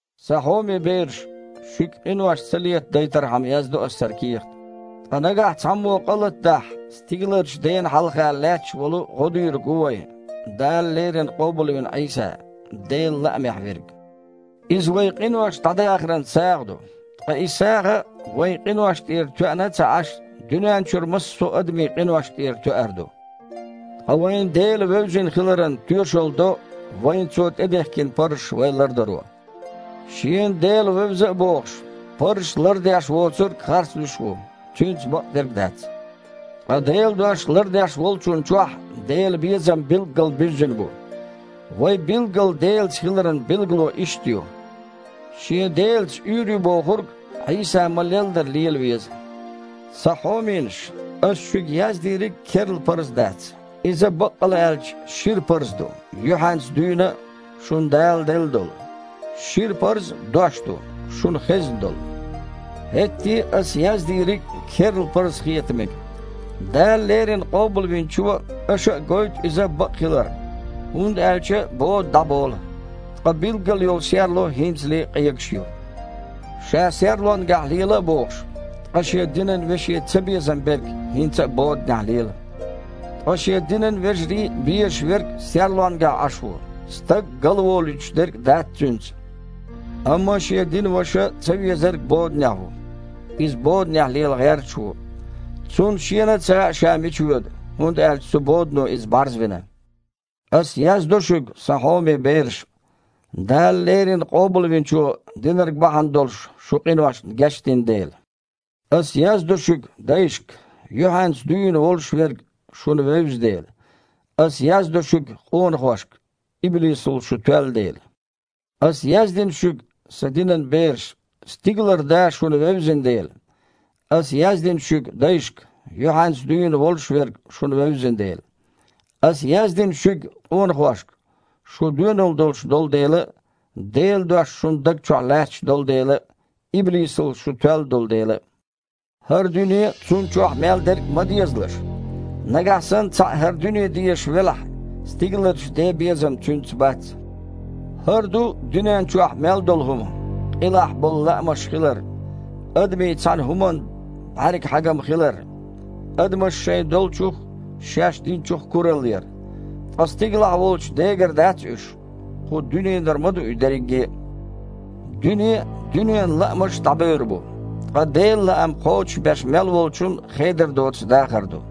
Сан хьоме бераш, шуьга къинош ца летадайтархьама яздо ас хІара кехат. Ткъа нагахь цхьаммо къа латадахь, стигаларчу Дена хьалха лаьтташ волу ГІодийриг ву вайн: Дала леррина къобалвина Іийса – Делан лаамехь Верг. Иза вайн къинош дІадахаран сагІа ду. Ткъа и сагІа, вайн къиношна тІера тоьъна а ца Іаш, дуьнен чуьра массо а адамийн къиношна тІера тоьар ду. Ткъа вайна Дела вевзина хиларан тоьшалла до вайна Цо тІедехкина парзаш вай лардаро. Шена Дела вевза а бохуш, парзаш лардеш воцург харцлуьйш а ву, цуьнца бакъдерг а дац. Ткъа Делан дош лардеш волчунна чохь Делан безам билггал буьззина бу. Вай билггал Делаца хиларан билгало иштта ю: шен Делаца уьйр ю бохург Іийса ма-леллара лела веза. Сан хьоменаш! Ас шуьга яздийриг керла парз дац – иза, баккъалла а аьлча, шира парз ду, юьхьанца дуьйна а шуна Дала делла долу. Шира парз – Дош ду, шуна хезна долу. ХІетте а аса яздийриг керла парз хета мега. Дала леррина Къобалвинчо а, аша а гойту иза бакъ хилар, хІунда аьлча бода дІаболу, ткъа билггал йолу серло хІинцале а къегаш ю. Ша серлонгахь лела а бохуш, ткъа шен динан веше цабезам берг хІинца а боданехь лела. Ткъа шен динан вежарий безаш верг серлонгахь Іаш ву – стаг галволуьйтуш дерг а дац цуьнца. Амма шен динан ваша цавезарг боданехь ву. Иза боданехь лела гІерташ ву. Цунна шена а ца хаьа, ша мича воьду, хІунда аьлча цу бодано иза бІарзвина. Ас яздо шуьга, сан хьоме бераш, Дала леррина Къобалвинчо динарг бахьана долуш шун къиношна гечдина дела. Ас яздо шуьга, дайшка, юьхьанца дуьйна волуш Верг шуна вевза дела. Ас яздо шуьга, къонахошка, иблисал шу тоьлла дела. Ас яздина шуьга, сан динан бераш, стигалара Да шуна вевзина дела. Ас яздина шуьга, дайшка, юьхьанца дуьйна волуш Верг шуна вевзина дела. Ас яздина шуьга, къонахошка, шу доьналла долуш долу дела а, Делан Дош шун даг чохь лаьтташ долу дела а, иблисал шу тоьлла долу дела а. ХІара дуьне а, цунна чохь мел дерг а ма дезалаш! Нагахь санна цхьаъ хІара дуьне дезаш велахь, стигаларчу Ден безам цуьнца бац. ХІара ду дуьнен чохь мел долу хІума: къилахь болу лаамаш хилар, адамийн цхьана хІуманна бІаьрган хьагам хилар, адамаша шайн долчух а, шаьш динчух а куралла яр. Ткъа стигалахь волчу Дегара дац уьш – кху дуьненара ма ду и дерриге а. Дуьне а, дуьненан лаамаш а дІабевр бу, ткъа Делан лаам кхочушбеш мел волчун хедар доцу дахар ду.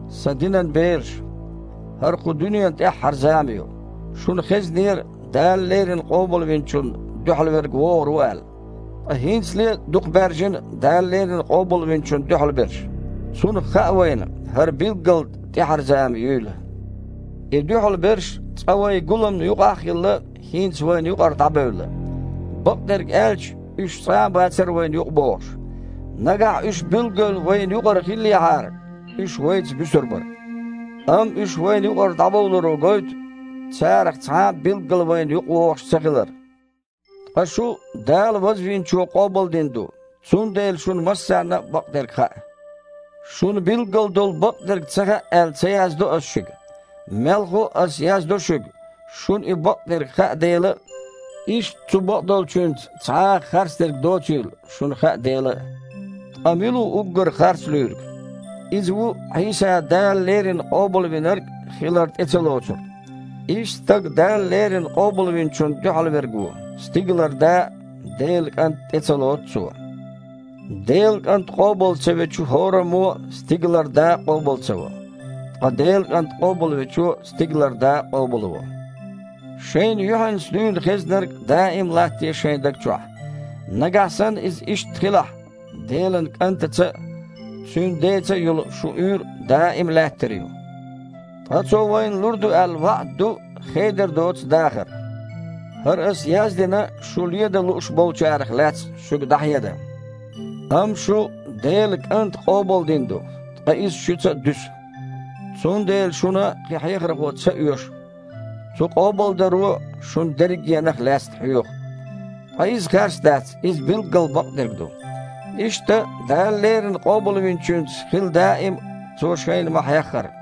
Сан динан бераш! ХІара кху дуьненан тІаьхьара зама ю. Шуна хезнера, Дала леррина Къобалвинчунна дуьхьал верг вогІур ву аьлла. Ткъа хІинцале а дукха баьржина Дала леррина Къобалвинчунна дуьхьал берш. Цунах хаьа вайна, хІара билггал тІаьхьара зама юйла. И дуьхьал берш, цкъа вайн гуламна юкъахь а хилла, хІинца вайна юкъара дІабевлла. Бакъдерг аьлча, уьш цкъа а бацара вайна юкъабогІуш. Нагахь уьш билггал вайна юкъара хиллехьара, уьш вайца буьсур бара. Амма уьш вайна юкъара дІабовларо гойту, царах цхьа а билггал вайна юкъавогІуш ца хилар. Ткъа шу Дала Вазвинчо къобалдина ду, цундела шуна массарна а бакъдерг хаьа. Шуна билггал долу бакъдерг ца хаьа аьлла, ца яздо ас шуьга. Мелхо а, ас яздо шуьга, шуна и бакъдерг хаьа дела а, иштта цу бакъдолчуьнца цхьа а харцдерг доцийла шуна хаьа дела а. Ткъа мила ву уггар харцлуьйриг? Иза ву Іийса Дала леррина Къобалвинарг хилар тІе ца лоцург. Иштта стаг Дала леррина Къобалвинчунна дуьхьал верг ву – стигалара Да а, Делан КІант а тІе ца лоцу цо. Делан КІант къобал ца вечу хІораммо а стигалара Да а къобал ца во. Ткъа Делан КІант къобалвечо стигалара Да а къобалво. Шайна юьхьанца дуьйна хезнарг даим а латтаде шайн даг чохь. Нагахь санна иза иштта хилахь, Делан КІантаца а, Цуьнан Деца а йолу шун уьйр даим а лаьттар ю. Ткъа Цо вайна лур ду аьлла ваІда ду: хедар доцу дахар. ХІара ас яздина шу ледан лууш болчарах лаьцна шуьга дІахьедан. Амма шу Делан КІанта къобалдина ду, ткъа иза шуьца дуьсу. Цундела шуна кхин хьехархо ца оьшу – цу къобалдаро шуна дерригенах лаьцна хьоьху. Ткъа иза харц дац – иза билггал бакъдерг ду. Иштта, Дала леррина Къобалвинчуьнца хила даим а, Цо шайна ма-хьеххара.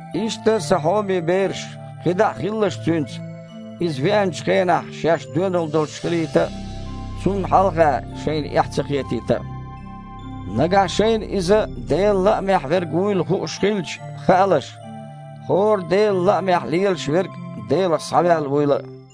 Иштта, сан хьоме бераш, кхидІа а хилалаш Цуьнца, Иза веанчу хенахь шаьш доьналла долуш хилийта а, Цунна хьалха шайна эхь ца хетийта а. Нагахь шайна Иза Делан лаамехь Верг вуй хууш хилча, хаалаш, хІора Делан лаамехь лелаш верг Делах схьаваьлла вуйла а.